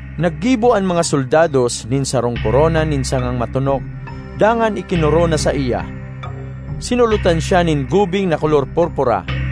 Naggibo an mga soldados nin sarong korona nin sangang matonok dangan ikinorona saiya; sinulotan siya nin gubing na kolor purpura.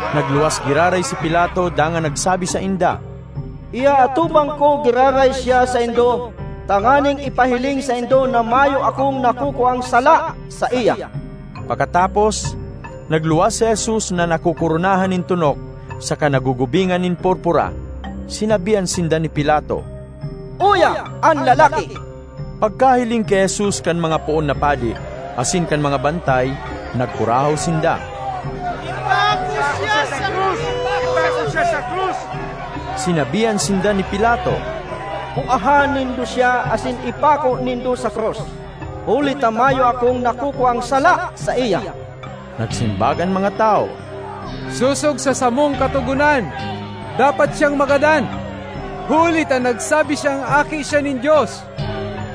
Nagluwas giraray si Pilato dangan nagsabi sainda, “Iaatubang ko giraray siya saindo tanganing ipahiling saindo na mayo akong nakukuang sala saiya.” Pakatapos, nagluwas si Jesus na nakokoronahan nin tonok saka nagugubingan nin purpura. Sinabihan sinda ni Pilato, “Uya an lalaki!” Pagkahiling ki Jesus kan mga poon na padi asin kan mga bantay, nagkurahaw sinda, “Ipako siya sa krus, ipako siya sa krus!” Sinabihan sinda ni Pilato, “Kuaha nindo siya asin ipako nindo sa krus, huli ta mayo akong nakukuang sala saiya.” Nagsimbag an mga tawo, “Sosog sa samong katogonan, dapat siyang magadan, huli ta nagsabi siyang Aki siya nin Dios.”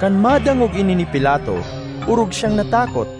Kan madangog ini ni Pilato, orog siyang natakot.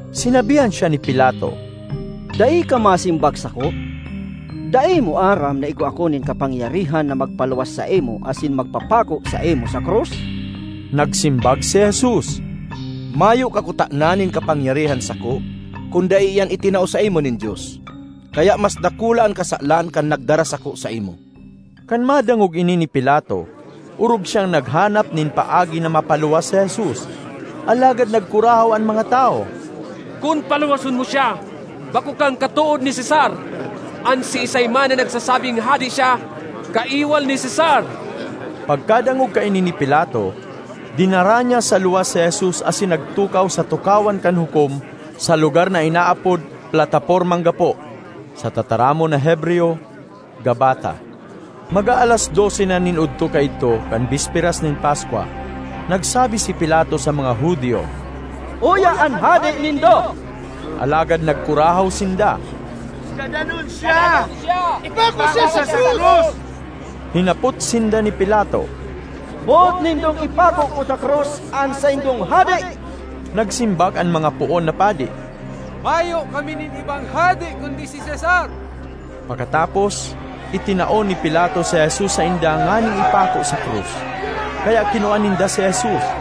Sinabihan siya ni Pilato, “Dai ka masimbag sako? Dai mo aram na igwa ako nin kapangyarihan na magpaluwas saimo asin magpapako saimo sa krus?” Nagsimbag si Jesus, “Mayo ka kutana nin kapangyarihan sako kun dai iyan itinao saimo nin Dios. Kaya mas dakula an kasalan kan nagdara sako saimo.” Kan madangog ini ni Pilato, orog siyang naghanap nin paagi na mapaluwas si Jesus. Alagad nagkurahaw an mga tawo. “Kun paluwason mo siya, bako kang katood ni Cesar! An siisay man na nagsasabing hade siya, kaiwal ni Cesar!” Pagkadangog kaini ni Pilato, dinara niya sa luwas si Jesus asin nagtukaw sa tukawan kan hukom sa lugar na inaapod “Platapormang Gapo,” (sa tataramon na Hebreyo, “Gabbatha.”) Mag-aalas dose na nin odto kaidto kan bisperas nin Paskwa. Nagsabi si Pilato sa mga Judio, “Uya an hade nindo!” Alagad nagkurahaw sinda, “Gadanon siya! Gadanon siya! Ipako siya sa krus!” Hinapot sinda ni Pilato, “Boot nindong ipako ko sa krus an saindong hade?” Nagsimbag an mga poon na padi, “Mayo kami nin ibang hade kundi si Cesar!” Pakatapos, itinao ni Pilato si Jesus sainda nganing ipako sa krus. Kaya kinua ninda si Jesus.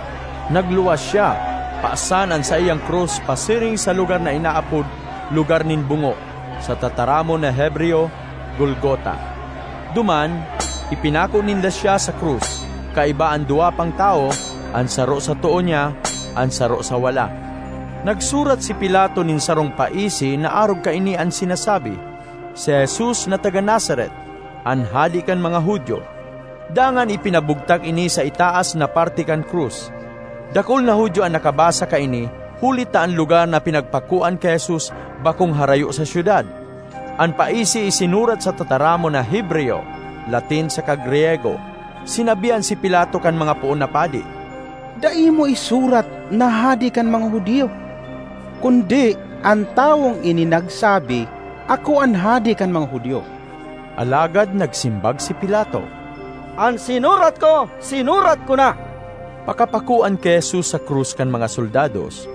Nagluwas siya, pasan an saiyang krus pasiring sa lugar na inaapod “Lugar nin Bungo,” (sa tataramon na Hebreyo, “Golgota.”) Duman, ipinako ninda siya sa krus, kaiba an duwa pang tawo—an saro sa too niya, an saro sa wala. Nagsurat si Pilato nin sarong paisi na arog kaini an sinasabi: “Si Jesus na taga Nazaret, an Hade kan mga Judio,” dangan ipinabugtak ini sa itaas na parte kan krus. Dakul na Judio an nakabasa kaini, huli ta an lugar na pinagpakoan ki Jesus bakong harayo sa syudad. An paisi isinurat sa tataramon na Hebreyo, Latin saka Griyego. Sinabihan si Pilato kan mga poon na padi, “Dai mo isurat na ‘Hade kan mga Judio,’ kundi, ‘An tawong ini nagsabi, Ako an Hade kan mga Judio.’” Alagad nagsimbag si Pilato, “An sinurat ko, sinurat ko na.” Pakapakoan ki Jesus sa krus kan mga soldados,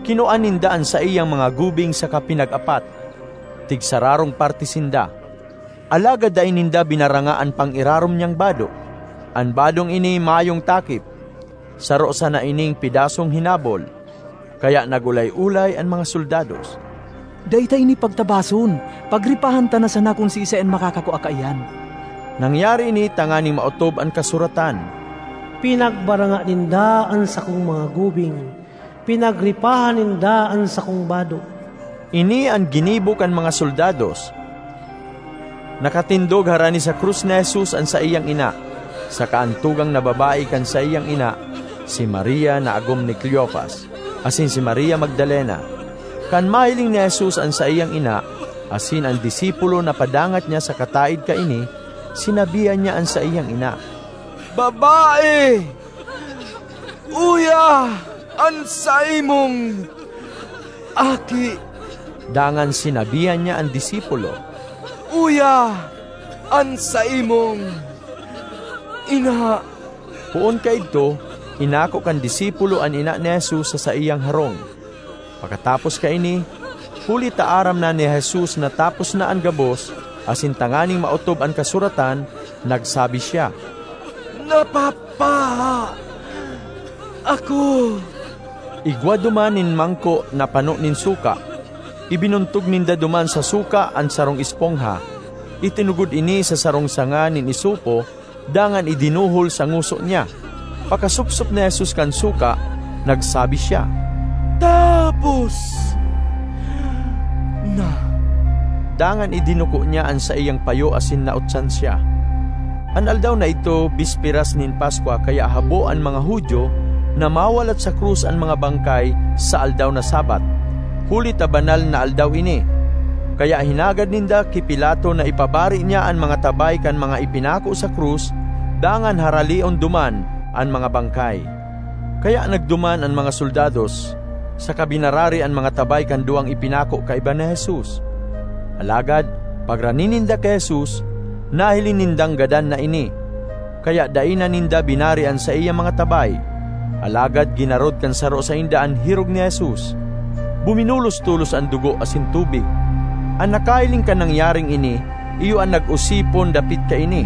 kinua ninda an saiyang mga gubing saka pinag-apat, tigsararong parte sinda. Alagad dai ninda binaranga an pang-irarom niyang bado. An badong ini mayong takip; saro sana ining pedasong hinabol. Kaya nag-olay-olay an mga soldados, “Dai ta ini pagtabason; pagripahan ta na sana kun siisay an makakakua kaiyan.” Nangyari ini tanganing maotob an kasuratan, “Pinagbaranga ninda an sakong mga gubing; pinagripahan ninda an sakong bado.” Ini an ginibo kan mga soldados. Nakatindog harani sa krus ni Jesus an saiyang ina, saka an tugang na babae kan saiyang ina, si Maria na agom ni Cleofas, asin si Maria Magdalena. Kan mahiling ni Jesus an saiyang ina, asin an disipulo na padangat niya sa kataed kaini, sinabihan niya an saiyang ina, “Babae, uya an saimong aki!” Dangan sinabihan niya an disipulo, “Uya an saimong ina!” Poon kaidto, inako kan disipulo an ina ni Jesus sa saiyang harong. Pakatapos kaini, huli ta aram na ni Jesus na tapos na an gabos, asin tanganing maotob an kasuratan, nagsabi siya, “Napapaha ako.” Igwa duman nin mangko na pano nin suka; ibinuntog ninda duman sa suka an sarong espongha, itinugod ini sa sarong sanga nin isopo dangan idinuhol sa ngoso niya. Pakasupsop ni Jesus kan suka, nagsabi siya, “Tapos na!” Dangan idinuko niya an saiyang payo asin nautsan siya. An aldaw na idto bisperas nin Paskwa kaya habo an mga Judio na mawalat sa krus an mga bangkay sa aldaw na Sabbath huli ta banal na aldaw ini. Kaya hinagad ninda ki Pilato na ipabari niya an mga tabay kan mga ipinako sa krus dangan haraleon duman an mga bangkay. Kaya nagduman an mga soldados saka binarari an mga tabay kan duwang ipinako kaiba ni Jesus. Alagad pagrani ninda ki Jesus, nahiling nindang gadan na ini, kaya dai na ninda binari an saiyang mga tabay. Alagad ginarod kan saro sainda an hirog ni Jesus; buminulos tolos an dugo asin tubig. (An nakahiling kan nangyaring ini iyo an nag-osipon dapit kaini,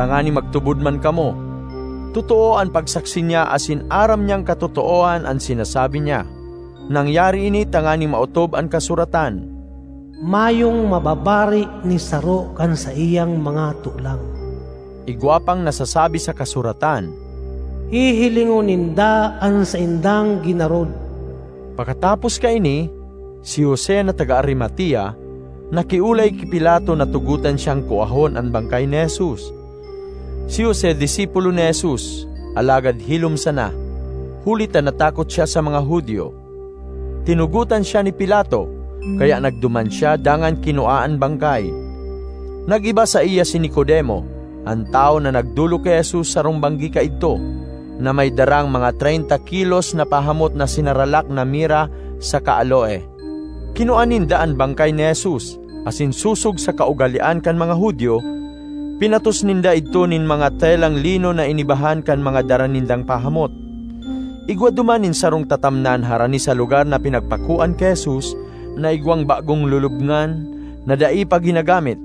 tanganing magtubod man kamo. Totoo an pagsaksi niya asin aram niyang katotoohan an sinasabi niya.) Nangyari ini tanganing maotob an kasuratan, “Mayong mababari ni saro kan saiyang mga tolang.” Igwa pang nasasabi sa kasuratan, “Hihilingon ninda an saindang ginarod.” Pakatapos kaini, si Jose na taga Arimatea nakiolay ki Pilato na tugotan siyang kuahon an bangkay ni Jesus. (Si Jose disipulo ni Jesus, alagad hilom sana, huli ta natakot siya sa mga Judio.) Tinugotan siya ni Pilato, kaya nagduman siya dangan kinua an bangkay. Nag-iba saiya si Nicodemo, an tawo na nagdolok ki Jesus sarong banggi kaidto, na may darang mga treynta kilos na pahamot na sinaralak na mira saka aloe. Kinua ninda an bangkay ni Jesus, asin sosog sa kaugalean kan mga Judio, pinatos ninda idto nin mga telang lino na inibahan kan mga dara nindang pahamot. Igwa duman nin sarong tatamnan harani sa lugar na pinagpakoan ki Jesus na igwang bagong lulubngan na dai pa ginagamit.